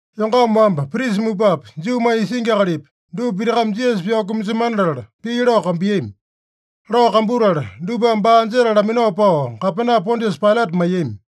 Yongama wamba, prisa mupapi, Juumanya isingi akalipi, dupa pitakame Jisasa pyao kumasemana latala, pii lao kambuiyami. Lao kambutala dupame baa anjetala laminao pao Gapena Pondiasa Pailata maiyami.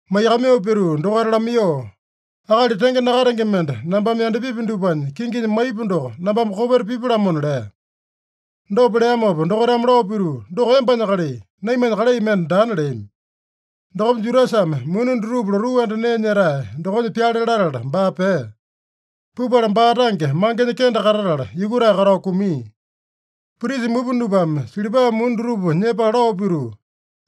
Maiyakamaiyoo pituu dokaita lamaiyoo, “Akali tenge nakatenge mende nambame yandapipi dupanya kinginya maipu doko, nambame kopeta pipu-lamona” lea. Dopa leamopa dokaitame lao pituu, “Doko embanya kalai. Naimanya kalai mende daana” leami. Dokopa Judasame muni dutupa lotuu anda nee nyetae dokonya pyale latala baa pea. Pupala baa tange mangenya kende katatala, yukutae katao kumia. Prisa mupa dupame silipa muni dutupa nyepala lao pituu,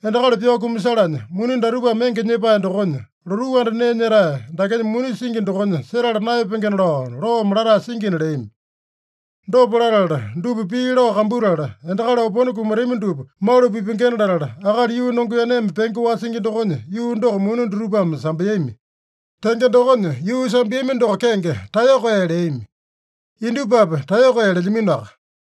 “Endakali pyao kumasalanya muni datupame enge nyepae dokonya, lotuu anda nee nyetae dakenya muni singi dokonya setala naeyapengena lao loome latae singina” leami. Dopa latala dupa pii lao kambutala, endakali opone kumatami dupa malu pipengena latala, akali yuu nongeaneme penge wasingi dokonya yuu doko muni dutupame sambeami. Tenge dokonya, yuu sambeami doko kenge Taeyoko Ee leami. Indupapi Taeyoko Ee lelyaminoaka.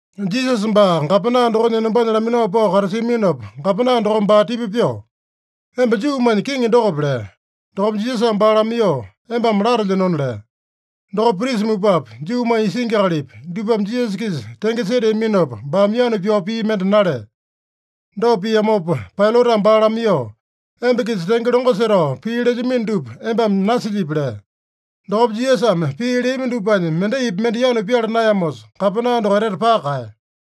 Jisasa baa gapena dokonya enombanya laminao pao katasiaminopa, gapena dokome baa tipa pyoo, “Emba Juumanya Kiŋi dokope?” lea. Dokopa Jisasame baa lamaiyoo, “Embame latelyenona” lea. Dokopa prisa mupapi, Juumanya isingi akalipi, dupame Jisasa-kisa tenge seteaminopa, baame yanu pyao pii mende nalea. Dopa piamopa Pailatame baa lamaiyoo, “Emba-kisa tenge longo setao pii lelyamino dupa embame nasilyipi?” lea. Dokopa Jisasame pii leami dupanya mendaipi mende yanu pyala naeyamosa, gapena doko etete paka kaeya.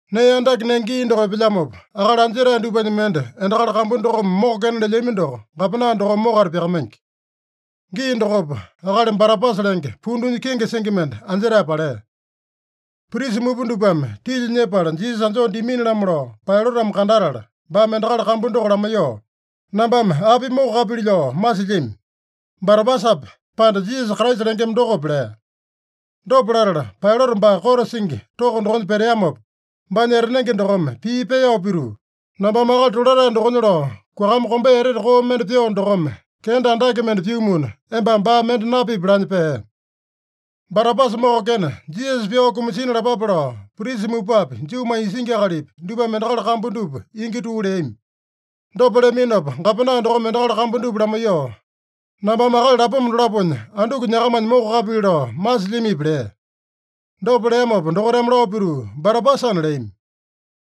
Nee andake nenge gii doko epelyamopa, akali anjetae dupanya mende endakali kambu dokome mokokena lelyami doko gapena dokome mokata pyakamaingi. Gii dokopa akali Barabasa lenge, pundunya kenge singi mende anjetae palea. Prisa mupa dupame tilya nyepala Jisasa anjoo dimini-lamo lao Pailatame kandatala, baame endakali kambu doko lamaiyoo, “Nambame api mokokapili lao masilyami? Barabasape, pande Jisasa Kraisa lengema dokope?” lea. Dopa latala, Pailata baa kote singi toko dokonya peteamopa, baanya etanenge dokome pii peyao pituu, “Nambame akali tolatae dokonya lao kuakama kombea etete koo mende pyoo dokome, kenda andake mende pyumuna, embame baa mende napipi” lanya pea. Barabasa mokokena, Jisasa pyao kumasina lapape lao prisa mupapi, Juumanya isingi akalipi, dupame endakali kambu dupa ingi tuu leami. Dopa leaminopa, gapena dokome endakali kambu dupa lamaiyoo, “Nambame akali lapoma dolaponya anduku nyakamanya mokokapili lao masilyamipi?” lea. Dopa leamopa dokaitame lao pituu, “Barabasana” leami.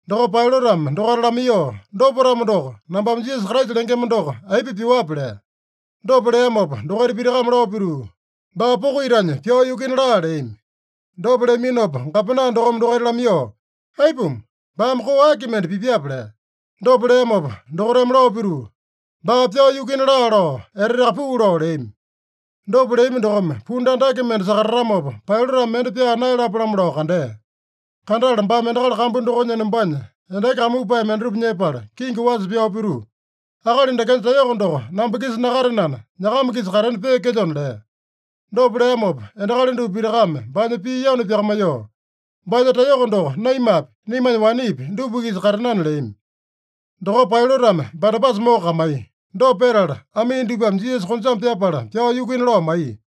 Dokopa Pailatame dokaita lamaiyoo, “Dopa-tamo doko, nambame Jisasa Kraisa lengema doko aipa pyuape?” lea. Dopa leamopa dokaita pitakame lao pituu, “Baa poko itanya pyao yukuina laa!” leami. Dopa leaminopa gapena dokome dokaita lamaiyoo, “Aipuma? Baame koo aki mende pipyape?” lea. Dopa leamopa dokaitame lao pituu, “Baa pyao yukuina laa!” lao eteteaka puu lao leami. Dopa leami dokome pundu andake mende sakatatamopa, Pailatame mende pyaa naeyalapo-lamo lao kandea. Kandatala baame endakali kambu dokonya enombanya endaki kamupae mendatupa nyepala, kingi wasa pyao pituu, “Akali dakenya taeyoko doko namba-kisa nakatenana, nyakama-kisa katena peekelyona” lea. Dopa leamopa endakali dupa pitakame baanya pii yanu pyakamaiyoo, “Baanya taeyoko doko naimapi, naimanya wanepi, dupa-kisa katenana!” leami. Dokopa Pailatame Barabasa mokokamaiya. Dopa petala amii dupame Jisasa konjame pyapala pyao yukuina lao maiya.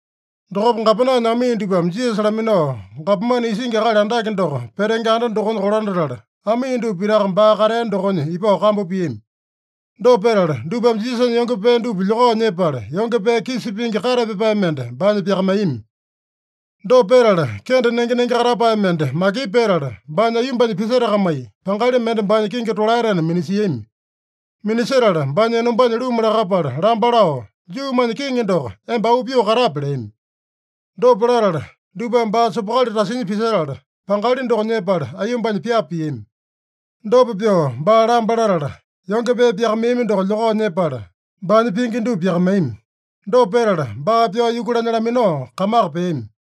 Dokopa gapenanya amii dupame Jisasa laminao, gapomane isingi akali andake doko petenge anda dokonya kolandatala, amii dupa pitaka baa katea dokonya ipao kambu piami. Dopa petala dupame Jisasanya yonge pee dupa lyokao nyepala, yonge pee kisa pingi kate pyapae mende baanya pyakamaiyami. Dopa petala kende nenge-nenge katapae mende makipu petala, baanya aiyombanya pisetakamai, pangali mende baanya kingi tolaetena minasiami. Minasetala baanya enombanya luma lakapala lamba lao, “Juumanya Kiŋi doko, emba auu pyoo katape!” leami. Dopa latala dupame baa sopokali tasinya pisetala, pangali doko nyepala aiyombanya pyapa piami. Dopa pyoo baa lamba latala, yonge pee pyakamaiyami doko lyokao nyepala, baanya pingi dupa pyakamaiyami. Dopa petala, baa pyao yukulanya laminao kamaka peami.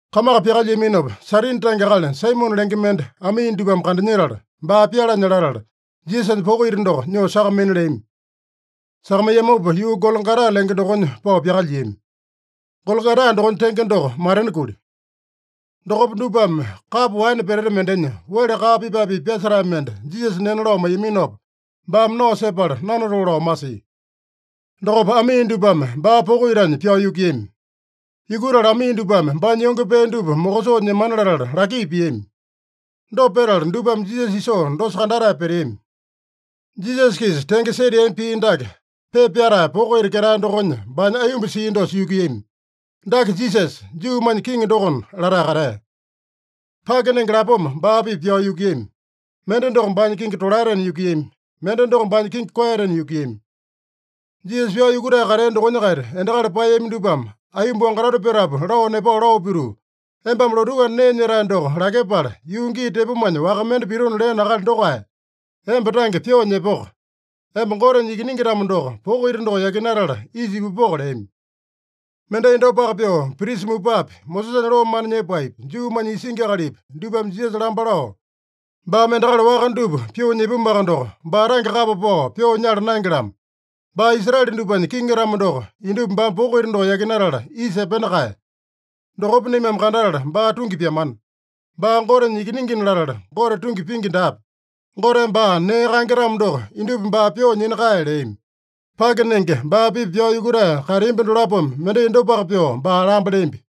Kamaka pyakalyiaminopa, Sairini tange akali Saimone lenge mende amii dupame kandanyetala, baa pyalanya latala, Jisasanya poko ita doko nyoo sakamaina leami. Sakamaiyamopa yuu Gologota lenge dokonya pao pyakalyiami. (Gologota dokonya tenge doko, Matena Kuli.) Dokopa dupame kapo waene peteta mendenya wele kaa pipae-pipa pyasetae mende Jisasa nena lao maiyaminopa, baame nao sepala, nanatoo lao masia. Dokopa amii dupame baa poko itanya pyao yukuiyami. Yukutala amii dupame baanya yonge pee dupa mokosoo nyemana latala laki piami. Dopa petala dupame Jisasa isoo dosa kandatae peteami. Jisasa-kisa tenge seteami pii dake pepa pyatae poko ita ketae dokonya baanya aiyomba sia dosa yukuiyami: “Dake Jisasa, Juumanya Kiŋi dokona” latae katea. Pake nenge lapoma baa-pipa pyao yukuiyami. Mende doko baanya kingi tolaetena yukuiyami. Mende doko baanya kingi koeyatena yukuiyami. Jisasa pyao yukutae katea dokonya-kaita endakali paeyami dupame aiyomba wangatoto petapu lao nepao lao pituu, “Embame lotuu anda nee nyetae doko lakyepala, yuu gii tepomanya waka mende pitona leeno akali dokae, emba tange pyoo nyepoko! Emba Gotenya Ikiningi-tamo doko, poko ita doko yakinatala isa ipupoko!” leami. Mendai dopaka pyoo, prisa mupapi, Mosesanya loo mana nyepaepi, Juumanya isingi akalipi, dupame Jisasa lamba lao, “Baame endakali waka dupa pyoo nyipumuaka doko, baa tange kapa pao pyoo nyala naenge-lamo. Baa Israele dupanya Kiŋi-tamo doko, indupa baame poko ita doko yakinatala isa epena kae. Dokopa naimame kandatala baa tungi pyamana. Baa Gotenya Ikiningina latala, Gote tungi pingi daape. Goteme baa nee kaenge-tamo doko, indupa baa pyoo nyina kae” leami. Pake nenge baa-pipa pyao yukutae kateambi dolapome mendai dopaka pyoo baa lamba leambi.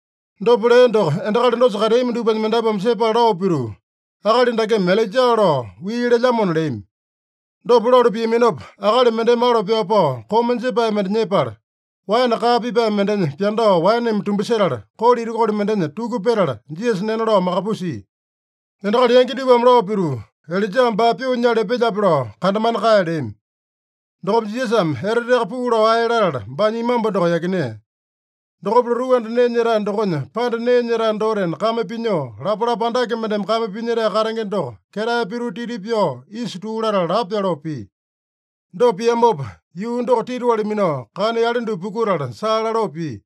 Dopa lea doko endakali dosa kateami dupanya mendapuame sepala lao pituu, “Akali dakeme Ilaija lao wii lelyamona” leami. Dopa lalu piaminopa, akali mendeme alo pyao pao, koma jepae mende nyepala, waene kaa pipae mendenya pyandao waeneme tumbasetala, kolo itakuli mendenya tuku petala, Jisasa nena lao makapusia. Endakali yangi dupame lao pituu, “Ilaijame baa pyoo nyala epelyape lao kandamana kae” leami. Dokopa Jisasame eteteaka puu lao ae latala, baanya imambu doko yakinea. Dokopa lotuu anda nee nyetae dokonya panda nee nyetae dotena kame pinyoo lapalapa andake mendeme kame pinyetae katenge doko ketae pituu titi pyao isa tuu latala lapo pyoloo pia. Dopa piamopa, yuu doko titiwali minao, kana yale dupa pukutala saa laloo pia.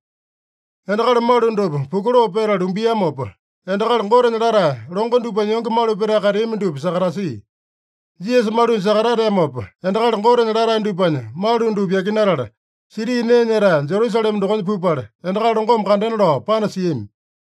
Endakali malu dupa pukuloo petala lumbiamopa, endakali Gotenya latae longo dupanya yonge malu petae kateami dupa sakatasia. (Jisasa malunya sakatateamopa, endakali Gotenya latae dupanya malu dupa yakinatala, siti nee nyetae Jerusalema dokonya pupala, endakali longome kandena lao panasiami.)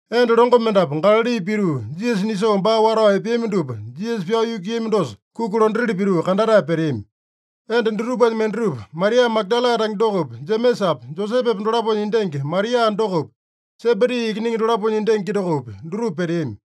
Enda longo mendapu Galali pituu, Jisasa nisoo baa watao epeami dupa Jisasa pyao yukuiyami dosa kuki londatili pituu kandatae peteami. Enda dutupanya mendatupa, Maria Magadala tange dokopi, Jemesapa, Josepepa dolaponya endangi Maria dokopi, Sebedi ikiningi dolaponya endangi dokopi, dutupa peteami.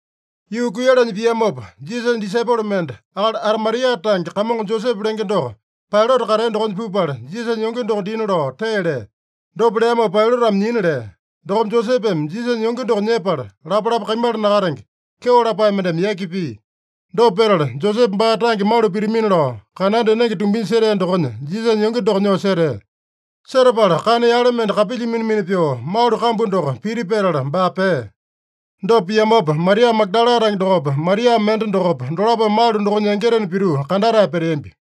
Yuu kuiyalanya piamopa, Jisasanya disaipolo mende, akali Arimatia tange kamongo Josepe lenge doko Pailata katea dokonya pupala, Jisasanya yonge doko dina lao tee lea. Dopa leamopa Pailatame nyina lea. Dokopa Josepeme Jisasanya yonge doko nyepala, lapalapa kaimala nakatenge, kyeo lapae mendeme yaki pia. Dopa petala, Josepe baa tange malu pitamina lao kananda enenge tumbinya setea dokonya Jisasanya yonge doko nyoo setea. Setapala kana yale mende kapilya mina-mina pyoo malu kambu doko piti petala, baa pea. Dopa piamopa, Maria Magadala tange dokopa, Maria mende dokopa, dolapome malu dokonya yangitena pituu kandatae peteambi.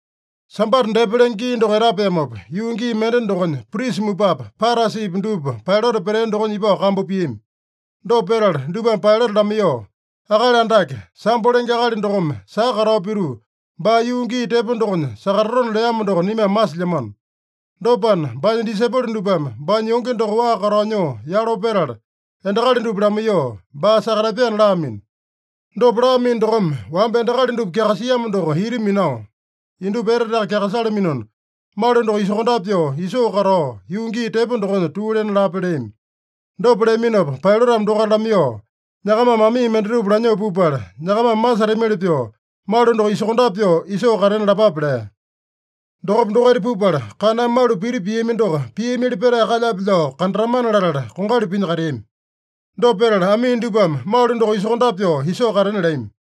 Sambata depa lenge gii doko etapeamopa, yuu gii mende dokonya, prisa mupapi, Parasipi dupa Pailata petea dokonya ipao kambu piami. Dopa petala dupame Pailata lamaiyoo, “Akali Andake, sambo lenge akali dokome saka katao pituu, baa yuu gii tepo dokonya sakatatona leamo doko naimame masilyamano. Dopana, baanya disaipolo dupame baanya yonge doko waa katao nyoo yalo petala, endakali dupa lamaiyoo, baa sakatapyana laamino. Dopa laamino dokome, wamba endakali dupa kyakasiamo doko ita minao, indupa eteteaka kyakasalaminona, malu doko isokondape pyoo isoo katao, yuu gii tepo dokonya tuu lena lape” leami. Dopa leaminopa Pailatame dokaita lamaiyoo, “Nyakamame amii mendatupa lanyoo pupala, nyakamame masetamili pyoo malu doko isokondape pyoo isoo katena lapape” lea. Dokopa dokaita pupala, kaname malu piti piami doko piamili petae kalyape lao kandatamana latala, kongali pinya kateami. Dopa petala amii dupame malu doko isokondape pyoo isoo katena leami.